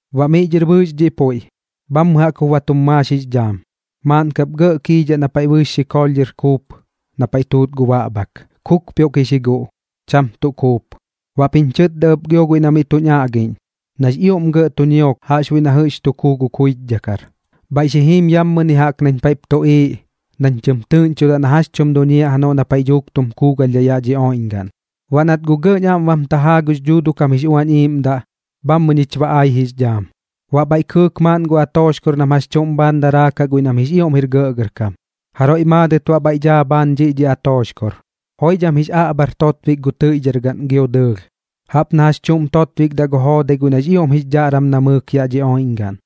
Baꞌ miꞌ dhɨr bɨɨx dhiꞌ puiꞌ, bhammɨ jaꞌk jup ba tum maax jix dhaam. Maaꞌn kap gɇꞌ kiidhaꞌ na paiꞌ bɨɨx xikoolh dhɨr kuup na paiꞌ tuut gu baꞌbhak, kupioꞌkix ji guꞌ, cham tuꞌ kuup. Baꞌp jiñ chɨtda ɨp gio guiꞌ na miꞌ tuñ aꞌgiꞌñ, nax ioꞌm gɇꞌ tu ñiok jaꞌxbuiꞌ na jɨꞌx tu kuu gu kuichdhakar: ―Bhaiꞌ xi jiim yammɨni jaꞌk nañ paiꞌp tuꞌiiꞌ, nañ tɨm tɨꞌñchodaꞌ na jax chum duñiaꞌ janoꞌ nañ paiꞌ dhuuk tu kuugalhdhaꞌ yaꞌ dhi oiꞌñgaꞌn. Baꞌ nat guꞌ gɇꞌñ aꞌm bam tajaa gux Dhuuduꞌ kam jix Uañ Iiꞌmdaꞌ, bhammɨ ñich ba ai jix dhaam. Baꞌ bhaiꞌ kɨɨk maaꞌn gu atooxkor nam jax chuꞌm bhaan daraakaꞌ guiꞌ nam jix ioꞌm jir gɇꞌgɇrkam. Jaroiꞌ maadɨt baꞌ bhaiꞌ dhaa bhaan dhiꞌ dhi atooxkor. Joidham jix aꞌbhar totbik gu tɨiꞌdhar gaꞌn gio dɨɨlh, jaꞌp na jax chuꞌm totbikdaꞌ gu joodai guiꞌ nax ioꞌm jix dhaꞌram namɨɨk yaꞌ dhi oiꞌñgaꞌn.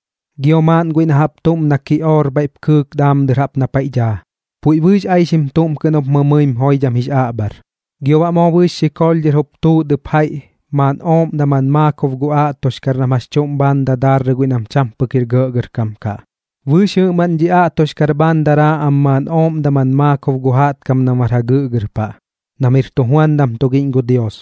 Gio maaꞌn guiꞌ na jaꞌp tuꞌm na kiꞌoor bhaiꞌp kɨɨk daam dɨr na paiꞌ daa, puiꞌ bɨɨx aixim tuꞌm kɨꞌn jup mɨmɨim joidham jix aꞌbhar. Gio baꞌ moo bɨɨx xikoolh dhɨr jup tuut ɨp jaiꞌ maaꞌn ooꞌm daman maakob gu aꞌtoxkar nam jax chuꞌm bhaan jup dadarrɨ guiꞌ nam cham pɨk jir gɇꞌgɇrkam kaꞌ. Bɨɨx jɨꞌmaꞌn dhi aꞌtoxkar bhaan daraa am maaꞌn ooꞌm daman maakob gu jaꞌtkam nam bar jagɨꞌgɨr paꞌ, nam jir tujuandam tugiꞌñ gu Dios.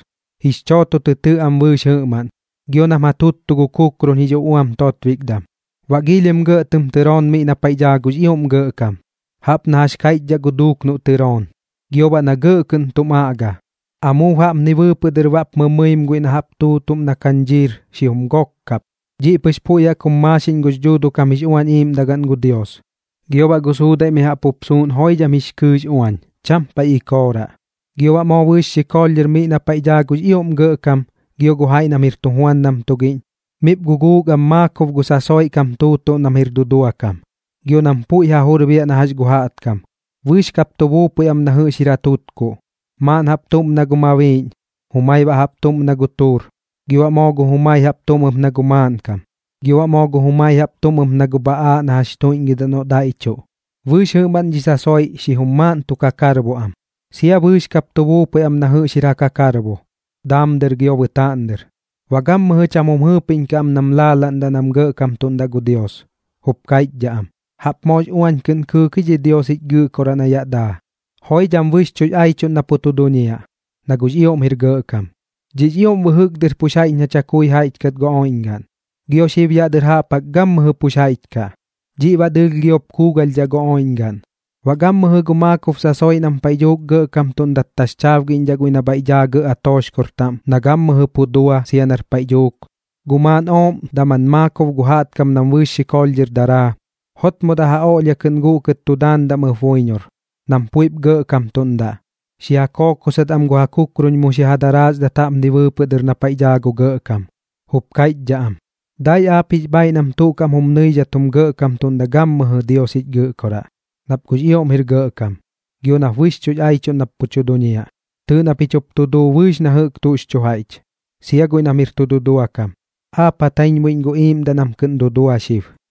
Jix chooto tɨ tɨꞌ am bɨɨx jɨꞌmaꞌn, gio nam ja tuttu gu kukrun jix uꞌuam totbikdam. Baꞌ giilhim gɇꞌ tɨm tɨroon miꞌ na paiꞌ daa gux ioꞌm Gɇꞌkam, jaꞌp na jax kaiꞌchdhaꞌ gu duuk noꞌ tɨrooñ, gio baꞌ na gɇꞌ kɨꞌn tum aꞌga. Amuub jaꞌpni bɨɨpɨꞌ dɨr baꞌp mɨmɨim guiꞌ na jaꞌp tuutuꞌm na kañdhiir xijum gok kap, dhiꞌ pɨx puiꞌ jaꞌk jum maaxiꞌñ gux dhuuduꞌ kam jix uꞌuañ iꞌiiꞌmdagaꞌn gu Dios. Gio baꞌ gu suudaiꞌ mi jaꞌp jup suuꞌn joidham jix kɨɨꞌx uañ, cham paiꞌ ikooraꞌ. Gio baꞌ moo bɨɨx xikoolh dhɨr miꞌ na paiꞌ daa gux ioꞌm Gɇꞌkam gio gu jaiꞌ nam jir tujuandam tugiꞌñ, miꞌp guguuk am maakob gu sasoiꞌ kam tuutuꞌm nam jir dudua kam gio nam puiꞌ ja jur jup biaꞌ na jax gu jaꞌtkam, bɨɨx kap tu buupui am na jɨꞌx jir ja tutkuꞌ. Maaꞌn jaꞌp tuꞌm na gu mabiiꞌñ, jumai baꞌ jaꞌp tuꞌm na gu tuur, gio baꞌ moo gu jumai jaꞌp tuꞌm ɨp na gu maaꞌnkam, gio baꞌ moo gu jumai jaꞌp tuꞌm ɨp na gu bhaꞌaaꞌ na jax tuiꞌñgɨdaꞌ noꞌ daiꞌchuꞌ. Bɨɨx jɨꞌmaꞌn dhi sasoiꞌ xijum maaꞌn tu kakarbo am, sia bɨɨx kap tu buupui am na jɨꞌx jir ja kakarbo, daam dɨr gio bɨtaaꞌn dɨr. Baꞌ gammɨjɨ cham jum jɨɨpiꞌñkaꞌ am nam laalaꞌndaꞌ nam gɇꞌkamtuꞌndaꞌ gu Dios, jup kaiꞌchdhaꞌ am: Jaꞌp moox uañ kɨꞌn kɨɨk ji dhi Dios jich Gɨꞌkoraꞌ na yaꞌ daa. Joidham bɨxchuꞌx aichuꞌn na pu tu duñiaꞌ, na guꞌx ioꞌm jir gɇꞌkam. Dhiꞌx ioꞌm bɨjɨk dɨr pux jaiꞌch na chakui jaiꞌch kat gu oiꞌñgaꞌn, gio xib yaꞌ dɨr jaꞌp jaꞌk gammɨjɨ pux jaiꞌch kaꞌ. Dhiꞌ baꞌ dɨɨlh giop kuugalhdhaꞌ gu oiꞌñgaꞌn. Baꞌ gammɨjɨ gu maakob sasoiꞌ, nam paiꞌ dhuuk gɇꞌkamtuꞌndat taxchaabgiꞌñdhaꞌ guiꞌ na bhaiꞌ daa gɇꞌ atooxkor taꞌm na gammɨjɨ pu dua sia nar paiꞌ dhuuk, gu maaꞌn ooꞌm daman maakob gu jaꞌtkam nam bɨɨx xɨkoolh dhɨr daraa, jotmodaꞌ ja oꞌlhia kɨꞌn guꞌkɨt tu daandaꞌm ɨp buiñor, nam puiꞌp gɇꞌkamtuꞌndaꞌ, xi ja kookosat am gu ja kukrun mu xi ja daraasdat jaꞌpni bɨɨpɨꞌ dɨr na paiꞌ daa gu Gɇꞌkam. Jup kaiꞌchdhaꞌ am: Dai aap jix bhaiꞌ nam tuꞌ kaꞌm jum nɨidhat jum gɇꞌkamtuꞌndaꞌ gammɨjɨ Dios jich Gɨꞌkoraꞌ, nap guꞌx ioꞌm jir gɇꞌkam, gio nap bɨxchuꞌx aichuꞌn nap pu tu duñiaꞌ. Tɨɨꞌ na pich jup tu duu bɨɨx na jɨꞌk tuꞌx chu jaiꞌch, sia guiꞌ nam jir tu dudua kam, aap ja taiñbuiꞌñ gu iiꞌmdaꞌ nam kɨꞌn dudua xib.